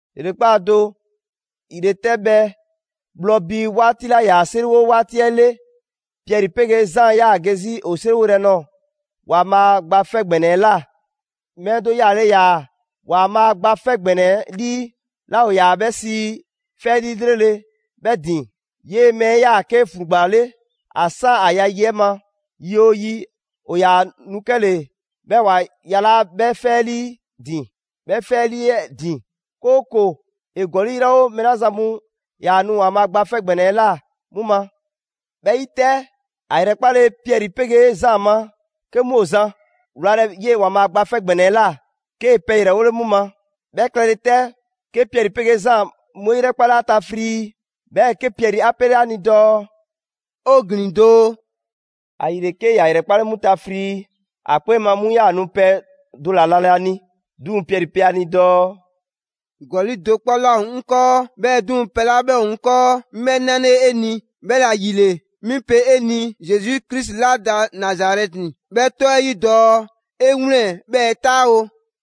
‑Yrekpaa' do, ‑yretɛbhɛ bhlɔ bii 'waati 'ɛ 'la 'yaa‑ 'seriwo 'waati 'ɛ 'le, Piɛri 'pegee Zaan 'yaa‑ ge 'zi ‑o 'seriwo yrɛ nɔɔ‑ ‑Waanbhaa' Gba 'Fɛ ‑Gbɛnɛ 'ɛ ꞊la. Mɛɛ do yaale ‑yaa ‑Waanbhaa' Gba 'Fɛ ‑Gbɛnɛ 'ɛ 'lii 'la ‑o ‑yaa 'bhɛ sii: «'Fɛ 'lii 'lrele‑» 'bhɛ ‑din. 'Yee‑ mɛɛ 'ɛ 'yaa‑ 'ke ‑flugba 'le ‑a 'san ‑a ya yi 'ɛ ma. Yi 'oo yi, ‑o ‑yaa nu 'kɛle‑ 'bhɛɛ‑ ‑wa yalaa' 'bhɛ 'fɛ 'lii 'ɛ ‑din, 'kooko‑ ‑e ‑gɔli' 'yrɛwo‑ mɛɛ 'la zan mu 'yaa‑ nu ‑Waanbhaa' Gba 'Fɛ ‑Gbɛnɛ 'ɛ ꞊la 'mu ma. 'Bhɛ 'yi 'tɛ, ‑a ‑yrɛkpale Piɛri 'pegee Zaan ma 'ke 'mu ‑o zan wlalɛ 'yee‑ ‑Waanbhaa' Gba 'Fɛ ‑Gbɛnɛ 'ɛ ꞊la, 'kee‑ pɛ ‑yrɛwole 'mu ma. 'Bhɛ klɛle 'tɛ, 'ke Piɛri 'pegee Zaan 'mu 'e ‑yrɛkpale ‑a ta frii, 'bhɛɛ‑ 'ke Piɛri 'a 'pele 'a ni dɔɔ: «'O ‑glin doo!» ‑Ayile, 'ke ‑ya ‑yrɛkpale 'mu ta frii, ‑a 'kpee ma 'mu 'yaa‑ nu pɛ do ‑la nalɛ ‑a ni. 'Duŋ‑ Piɛri pe ‑a ni dɔɔ: «‑Gɔli' do 'kpɔ 'laa ‑o 'ŋ 'kɔɔ, 'bhɛɛ‑ 'duŋ‑, pɛ 'la 'bhɛ ‑o 'ŋ 'kɔɔ, 'ŋ 'bhɛɛ‑ 'nale‑ 'e ni, 'bhɛla‑ ‑yile 'mi pe 'e ni Zesu Krisi la da Nazarɛti 'bhɛ 'tɔ 'ɛ 'yi dɔɔ 'e 'wlɛn‑ 'bhɛɛ‑ 'taawo!»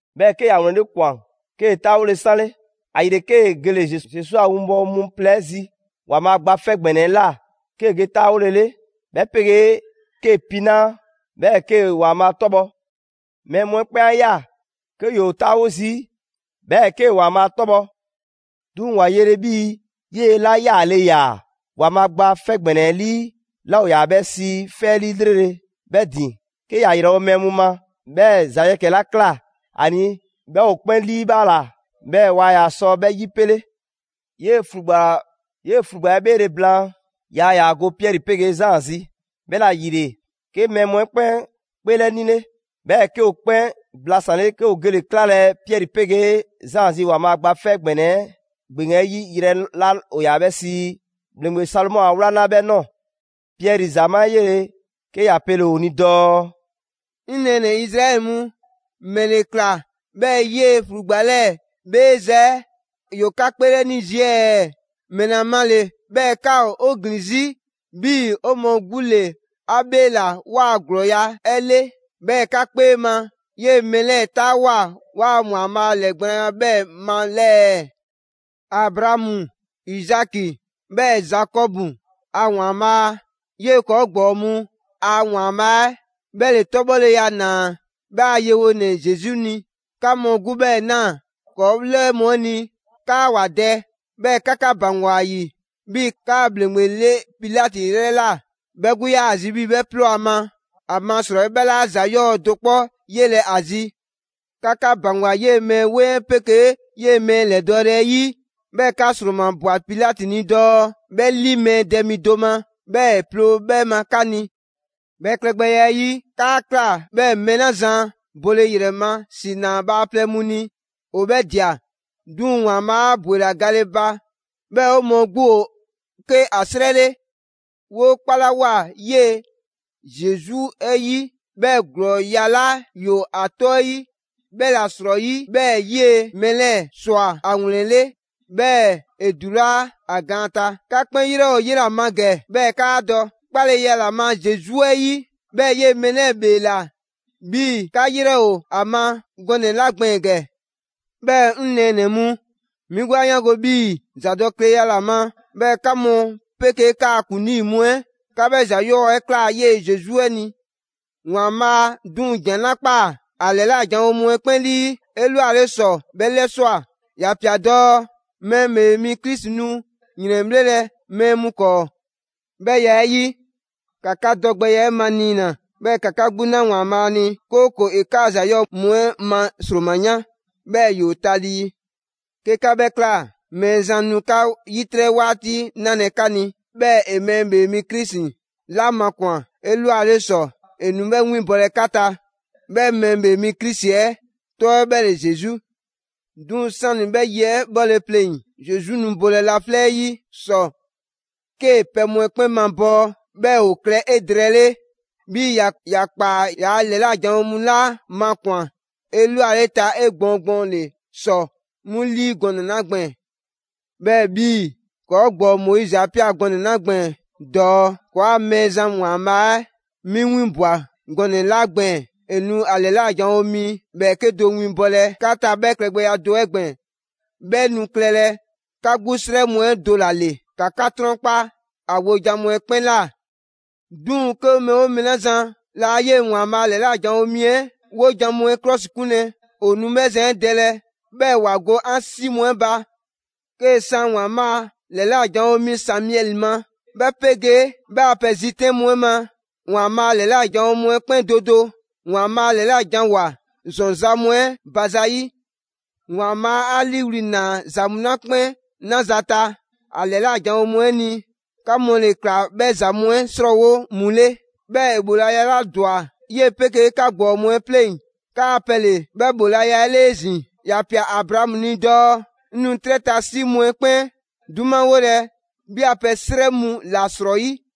'bhɛɛ‑ 'ke ‑ya ‑wlɛnle' ꞊kwan, 'kee‑ 'taawole 'sanle. ‑Ayile, 'kee‑ gele‑ Zesu a 'winbɔwo mu plɛ 'ɛ zi ‑Waanbhaa' Gba 'Fɛ ‑Gbɛnɛ 'ɛ ꞊la, 'kee‑ ge 'taawolele, 'bhɛ 'pegee 'kee‑ pinaa', 'bhɛɛ‑ 'kee‑ ‑Waanbhaa' 'tɔbhɔ. Mɛɛ mu 'ɛ 'kpɛn 'a ꞊ya 'ke ‑yoo 'taawo zii', 'bhɛɛ‑ 'kee‑ ‑Waanbhaa' 'tɔbhɔ‑. 'Duŋ‑ ‑wa yele 'bhii‑ 'yela‑ yaale ‑yaa ‑Waanbhaa' Gba 'Fɛ ‑Gbɛnɛ 'lii 'la ‑o ‑yaa 'bhɛ sii: ‹'Fɛ 'lii 'lrele‑› 'bhɛ ‑din, 'ke ‑ya ‑yrɛwo' mɛɛ mu ma, 'bhɛɛ‑ ‑za yɛkɛ‑ 'la ꞊kla ‑a ni 'bhɛ ‑o 'kpɛn 'liibhaala, 'bhɛɛ‑ waa ‑yaa sɔ 'bhɛ 'yipele. 'Yee‑ ‑flugba 'ɛ ‑bheele' blaan, yaa ‑yaa go Piɛri 'pegee Zaan zi; 'bhɛla‑ ‑yile, 'ke mɛɛ mu 'ɛ 'kpɛn 'kpeelɛnile. 'Bhɛɛ‑ 'ke ‑o 'kpɛn blasanle 'ke ‑o gele‑ 'klalɛ‑ Piɛri 'pegee Zaan zi ‑Waanbhaa' Gba 'Fɛ ‑Gbɛnɛ 'ɛ ‑gbeŋ 'ɛ 'yi yrɛ 'la ‑o ‑yaa 'bhɛ sii: «‑Bhleŋgbe Salomɔ a 'wlaŋla» 'bhɛ ꞊nɔɔ. Piɛri ‑zamaa' 'ɛ 'yele‑, 'ke ‑ya pele‑ ‑o ni dɔɔ: «'Ŋ nɛɛnɛ‑ Izraɛli mu, ‑mɛle ꞊kla 'bhɛɛ‑ 'yee‑ ‑flugba 'lɛɛ‑ 'bheeza‑ 'ɛ ‑yoo 'ka 'kpeelɛni zii' ɛɛ? ‑Mɛla ma ‑le 'bhɛɛ‑ 'ka ‑o 'o ‑glin 'zi 'bhii‑ 'o mɔɔ 'gbu ‑le 'a 'bheela‑ 'waa‑ ‑glɔɔya' 'ɛ 'le? 'Bhɛɛ‑ 'ka 'kpee ma 'yee‑ mɛɛ 'lɛɛ‑ 'taawoa꞊ 'waa‑ ‑Waanbhaa' a ‑lɛɛgblaanya 'bhɛɛ‑ ma ‑lɛɛ? Abraamu, Izaki 'bhɛɛ‑ Zakɔbu a ‑Waanbhaa', 'yee‑ ‑kɔɔ' ‑gbɔɔ mu a ‑Waanbhaa' 'ɛ, 'bhɛ ‑le 'tɔbhɔleya ‑naa 'bhɛ a yewonɛ Zesu ni. 'Ka mu 'gbu 'bhɛ꞊naa ‑kɔɔ' 'lɛɛ mu 'ɛ ni 'kaa ‑wa dɛ, 'bhɛɛ‑ 'ka 'ka ‑baŋgwa ‑a ‑yi 'bhii‑ 'kaa‑ ‑bhleŋgbe 'le Pilati 'yrɛ ꞊la. 'Bhɛ 'gbu 'yaa‑ zi 'bhii‑ 'bhɛ 'ploo ‑a ma, ‑amasrɔyi 'bhɛ 'laa ‑za 'yɔɔ‑ do 'kpɔ 'yelɛ‑ ‑a zi. 'Ka 'ka ‑baŋgwa 'yee‑ mɛɛ 'weŋ 'pegee 'yee‑ mɛɛ ‑lɛdɔɔle 'ɛ 'yi, 'bhɛɛ‑ 'ka ‑sromabwa Pilati ni dɔɔ 'bhɛ 'li mɛɛ dɛ mi do ma, 'bhɛɛ‑ ‑e 'ploo‑ 'bhɛ ma 'ka ni. 'Bhɛ klɛgbɛya 'ɛ 'yi, 'kaa ꞊kla 'bhɛɛ‑ mɛɛ 'la zan bole ‑yrɛ ma ‑si na bhaaplɛŋ mu ni ‑o 'bhɛɛ‑ ꞊dia. 'Duŋ‑ ‑Waanbhaa' 'a ‑bwela gale ba, 'bhɛɛ‑ 'o mɔɔ 'gbu ‑o 'ke ‑a 'srɛ 'le. 'Woo 'kpalawoa 'yee‑ Zesu 'ɛ 'yi, 'bhɛɛ‑ ‑glɔɔya' 'la ‑yoo ‑a 'tɔ 'ɛ 'yi, 'bhɛ ‑la 'srɔyi 'bhɛɛ‑ 'yee‑ mɛɛ 'lɛɛ‑ ꞊swa ‑a ‑wlɛnle', 'bhɛɛ‑ ‑e ‑dulaa' ‑a gaan ta. 'Ka 'kpɛn 'yrɛ ‑o 'yela‑ ma ‑gɛ, 'bhɛɛ‑ 'kaa dɔ. 'Kpaleya ‑la ma Zesu 'ɛ 'yi, 'bhɛɛ‑ 'yee‑ mɛɛ 'lɛɛ‑ 'bheela‑ 'bhii‑ 'ka 'yrɛ ‑o ‑a ma gɔnɛ‑ 'la gbɛɛn‑ ‑gɛ.» «'Bhɛɛ‑ 'ŋ nɛɛnɛ‑ mu, 'mi 'gbu 'a 'yaango‑ 'bhii‑ ‑zadɔkleya ‑la ma 'bhɛɛ‑ 'ka mu 'pegee 'kaa‑ ‑kuŋlii mu 'ɛ 'ka 'bhɛ ‑za 'yɔɔ‑ 'ɛ ꞊kla 'yee‑ Zesu 'ɛ ni. ‑Waanbhaa' 'duŋ‑ ‑jan 'la ꞊kpaa ‑a ‑lɛla' janwo mu 'ɛ 'kpɛn 'lii 'elwale ‑sɔ 'bhɛ 'lɛswa꞊. ‑Ya ꞊pia dɔɔ Mɛɛ ‑Bhee Mi Krisi nu ‑yrɛnbhlelɛ mɛɛ mu 'kɔɔ‑. 'Bhɛ ya 'ɛ 'yi, ‑ka 'ka dɔgbɛya 'ɛ maniina, 'bhɛɛ‑ ‑ka 'ka 'gbu 'na ‑Waanbhaa' ni, 'kooko‑ ‑e 'kaa ‑za 'yɔɔ‑ mu 'ɛ ma ‑sroma yan, 'bhɛɛ‑ ‑yoo talii. 'Ke 'ka 'bhɛ ꞊kla, Mɛɛzan nu 'ka 'yitrɛ 'waati 'nalɛ‑ 'ka ni, 'bhɛɛ‑ ‑e Mɛɛ ‑Bhee Mi Krisi 'la makwan‑ 'elwale ‑sɔ, ‑e nu 'bhɛ 'winbɔlɛ 'ka ta: 'bhɛ Mɛɛ ‑Bhee Mi Krisi 'ɛ 'tɔ 'ɛ 'bhɛ ‑le Zesu. 'Duŋ‑ 'sani‑ 'bhɛ yi 'ɛ 'bhɔle‑ pleŋ‑, Zesu nu bolɛ laflɛ' 'yi ‑sɔ 'ke pɛ mu 'ɛ 'kpɛn mabɔɔ 'bhɛɛ‑ ‑o klɛ 'edrɛɛle; 'bhii‑ ‑ya ꞊kpaa ‑ya ‑lɛla' janwo mu 'la makwan‑ 'elwaleta 'egbɔɔn gbɔɔnle' ‑sɔ 'mu 'lii gɔnɛ‑ 'la gbɛɛn‑. 'Bhɛɛ‑ 'bhii‑ ‑kɔɔ' ‑gbɔɔ Moizi 'a ꞊pia gɔnɛ‑ 'la gbɛɛn‑ dɔɔ: ‹‑Kɔɔa' Mɛɛzan ‑Waanbhaa' 'mi 'winbwa‑ gɔnɛ‑ 'la gbɛɛn‑, ‑e nu ‑a ‑lɛla' janwo mi ‑bhɛɛke' do winbɔlɛ 'ka ta 'bhɛ klɛgbɛya do 'ɛ gbɛɛn‑; 'bhɛ nu klɛlɛ 'ka 'gbu 'srɛ mu 'ɛ do ‑la ‑le. ‑Ka 'ka 'trɔnkpa ‑a wojan mu 'ɛ 'kpɛn ꞊la. 'Duŋ‑ 'ke mɛɛ 'oo mɛɛ 'la zan laa 'yee‑ ‑Waanbhaa' ‑lɛla' janwo mi 'ɛ 'wojan‑ mu 'ɛ 'klɔsikunlɛ, ‑o nu 'bhɛ zan 'ɛ dɛlɛ, 'bhɛɛ‑ ‑wa go 'an 'si mu 'ɛ ba.› 'Kee‑ san ‑Waanbhaa' ‑lɛla' janwo mi Samiɛli ma, 'bhɛ 'pegee 'bhɛ a pɛ zitɛn' mu 'ɛ ma, ‑Waanbhaa' ‑lɛla' janwo mu 'ɛ 'kpɛn do do ‑Waanbhaa' ‑lɛlajanwoa ‑zɔn ‑za mu 'ɛ ba za 'yi. ‑Waanbhaa' 'a 'liiwli‑ ꞊naa ‑za mu 'la 'kpɛn 'naza‑ ta ‑a ‑lɛla' janwo mu 'ɛ ni, 'ka mu ‑le ꞊kla bhɛ ‑za mu 'ɛ 'srɔɔwo mu 'le. 'Bhɛɛ‑ ‑e ‑bhoolaya 'la ‑dwa 'yee‑ 'pegee 'ka ‑gbɔɔ mu 'ɛ 'pleŋ, 'kaa‑ pɛ ‑le 'bhɛ ‑bhoolaya 'ɛ 'le 'ezin‑; ‑ya ꞊pia Abraamu ni dɔɔ: ‹'Ŋ nu 'trɛ ta 'si mu'ɛ 'kpɛn 'dumawolɛ 'bhi a pɛ 'srɛ mu ‑la ‑srɔyi'.›